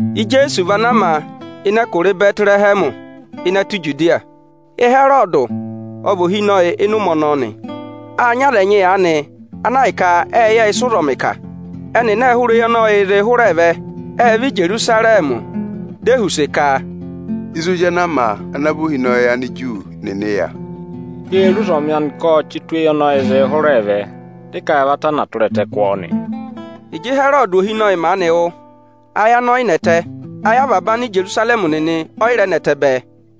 Ijeesu vị ana a ma ịnị ẹkụra Ịbẹtịrẹhẹmị ịnị ẹtẹ Ijudiya. Ịhẹrọdị ọ vị ohinọyị ịnị ụmẹ ọnọọ nị. Â nyị aza ẹnyị aanị ana ahịka ệ yẹ ịsị ụzọmịị̄ ka. Ẹnịnị ệ hụrẹ eyi ọnị ọyịị̄ zịị hụrẹẹ vẹ, ệ vẹ Ijerusarẹmị. Dị e họ̀ use ka: ịzị ozi ana a ma ana vaa vị ohinọyị Aniju nịnị ya? Ẹ ka ẹnị ê re ụzọmị anị ka ộ chị tụ eyi ọnị ọyịị̄ zịị hụrẹẹ vẹ, dị ẹnị vẹ ka ẹnị ẹ̀ va vaku ẹtẹ kụ ọ nị. Ịjị Ịhẹrọdị maanị wụ́, ayị anị ọ yị nẹtẹ, ayị avaba Anijerusarẹmị nịnị ẹ́ yị rẹ nẹtẹ bẹẹ.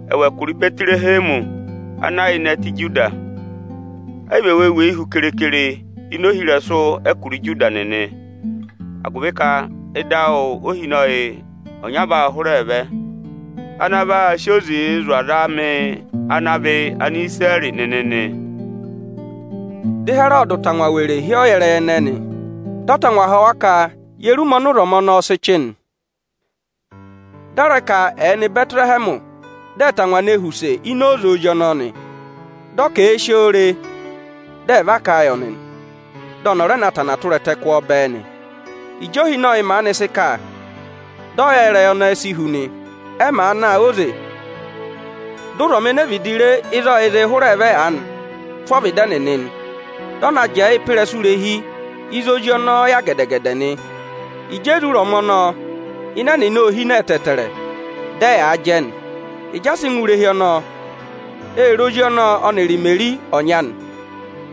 Ẹwụ ẹkụra Ịbẹtịrẹhẹmị ana ya ịnị ẹtẹ Ijuda, ẹ yị vị ẹwụ o weyi hu keekere ini ohirẹsụ ẹkụra Ijuda nịnị, agụvị ka ịdị awụ óhinọyị ọnya vaa hụrẹẹ vẹ ana vaa sị oze zụ̀ aza amị ana vị Anisirẹrị nịnị nị. Dị Ịhẹrọdị tangwa were hị́ ọyẹrẹyị ẹnẹẹ nị. Dị ọ tangwa họ̀ wa ka ye re ụmẹ ọnị ụzọmị ọnọọ sị chị nị. Dị ọ rẹ ka ẹ̀ nọ Ịbẹtịrẹhẹmị, dị ẹ̀ tangwa ne họ̀ use ini oze ozi ọnọọ nị. Dị ọ ka èe si o re, dị ẹ̀ va kà a yị ọnị, dị ọnị ọ̀ rẹ na va ku ẹtẹ kụ ọ bẹẹ nị. Ịjị ohinọyị maanị sị kà, dị ọyẹrẹyị ẹnẹẹ si hu nị. Ẹ maa na óze, dị ụzọmị ene vịdị re ịzị ọyịị̄ zịị hụrẹẹ vẹ aanị tụ ọvịdị ẹnịnị nị. Dị ọ na jẹẹ ịrẹsụ irehi ịzị ozi ọnọọ ya gẹdẹ-gẹdẹ nị. Ịjị e re ụzọmị ọnọọ, ịnẹ ẹnịnị ô hine ẹtẹẹtẹrẹ, dị ẹyaa jẹ nị. Ịjị ẹ sị ngụ ịnị irehi ọnọọ, ê re ozi ọnọọ ọnịrị Imeri ọnyị anị,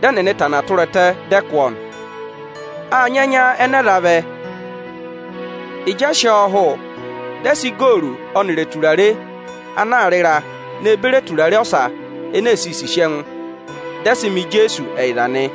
dị ẹnịnị va ku ẹtẹ, dị ẹ kụ ọ nị. Â nyị ẹnya ẹnẹ ẹ za na, ịjị ẹ sị ọ hụ, dị ẹ sị igooru ọnịrị eturare ana aā rị ịra ne beri eturare ọsa ene e siī sisi ẹngụ, dị ẹ sị mẹ Ijeesu ẹyịza nị.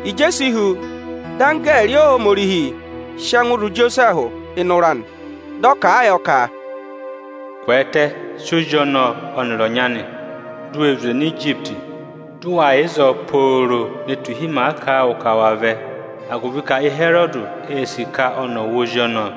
Ịjị e si hu, dị anggẹẹrị Ohomorihi sị ẹngụ zụ̀ Ijosẹẹhụ ịnị ụra nị. Dị ọ kà a yọ ka, ọ̀ kwẹẹtẹ dị ò si ozi ọnọọ ọnịrị ọnyị anị, dị ò zwe nọ Ijipiti nị. Ọ kà ọ̀ yà ịzọọ pooro ne tu ịhị ọnị ọnị ọ̀ọ kà a yọ ka ọọ vẹ, agụvị ka Ịhẹrọdị ee si ka ọnị ọ̀ wụ ozi ọnọọ.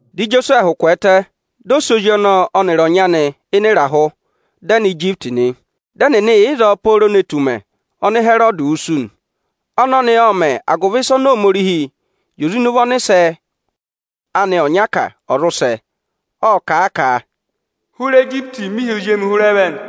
Dị Ijosẹẹhụ kwẹẹtẹ, dị ọ sị ozi ọnọọ ọnịrị ọnyị anị ịrahụ, dị ẹ nọ Ijipiti nị. Dị ẹnịnị yà ịzọọ pooro ne tu ụmẹ ọnị Ịhẹrọdị wusu nị. Ọnọnị ộ mẹ̀ agụvị ịsa ọnị Ohomorihi zi oze ịnị ụvọ ọnịsẹ anị ọnya ka, ọ̀ zụ sẹ. Ộ kà a ka, “Hụrị ẹtẹ Ijipiti mị hị́ ozi emi hụrẹ vẹ nị”.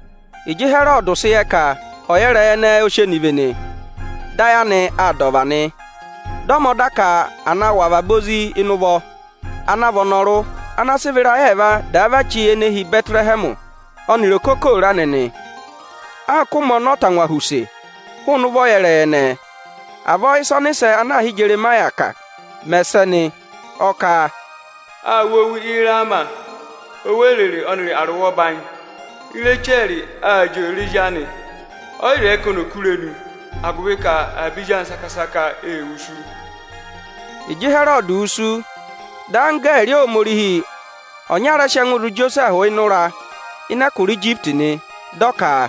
Ịjị Ịhẹrọdị sị yẹ ka ọyẹrẹyị ẹnẹnị ẹ sị ọnị vene, dị ayị anị aa dà ọva nị. Dị ọ mẹ ọda ka à na wụ̀ avaba ezinụvọ ana vị ịrayị ẹẹva vachi ene hi Ịbẹtịrẹhẹmị ọnịrị okokooro anị nị, anka ụmẹ ọnị ọ́ tangwa họ̀ use hụụnị ụvọ ọyẹrẹyị ẹnẹẹ nị. Avọọ ị́sa ọnị ọnịsẹ ana aā hị́ Ijeremaya kà mẹ̀ sẹ nị. Ọ kà, “Â wụ́ owu Ịrama, owu orere ọnịrị arụwẹ ọbanyị. Irechẹrị aa jị òrèrè ezi anị; ọ́ yị zẹẹ ka ọnị ò ku irenu agụvị ka avaba ezi anị saka-saka ê wusu”. Ịjị Ịhẹrọdị wusu, dị anggẹẹrị Ohomorihi ọnya rẹ sị ẹngụ zụ̀ Ijosẹẹhụ ịnị ụra ịnị ẹtẹ Ijipiti nị, dị ọ ka,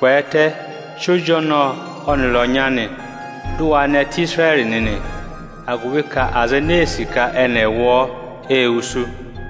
“Kwẹẹtẹ, sị ozi ọnọọ ọnịrị ọnyị anị, dị ụ wa nọ ịnị ẹtẹ Isirẹrị nịnị, agụvị ka aza enee sì ka ẹnị ẹ̀ wụ ọ ê wusu”.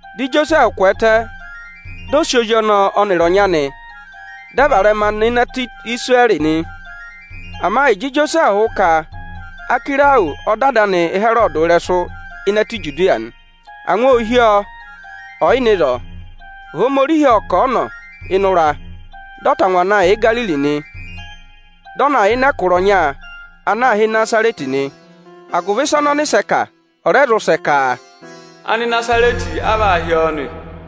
Dị Ijosẹẹhụ kwẹẹtẹ, dị ọ sị ozi ọnọọ ọnịrị ọnyị anị dị ẹ varẹma nọ ịnị ẹtẹ Isirẹrị nị. Ama ịjị Ijosẹẹhụ wụ ka Achẹrọsị ọ dọ ada anị Ịhẹrọdị ịrẹsụ ịnị ẹtẹ Ijudiya nị, angwa ô hí ọ ọyị nọ ịzọọ. Ohomorihi ộ kà a ọnọ ịnị ụra, dị ọ tangwa na yà Igariri nị. Dị ọ na yà ịnị ẹkụra ọnya ana aā hị́ Ịnazarẹtị nị, agụvị ịsa ọnị ọnịsẹ kà, ọ̀ rẹ zụ sẹ ka, “Anịnazarẹtị á vaa hị́ ọ nị.”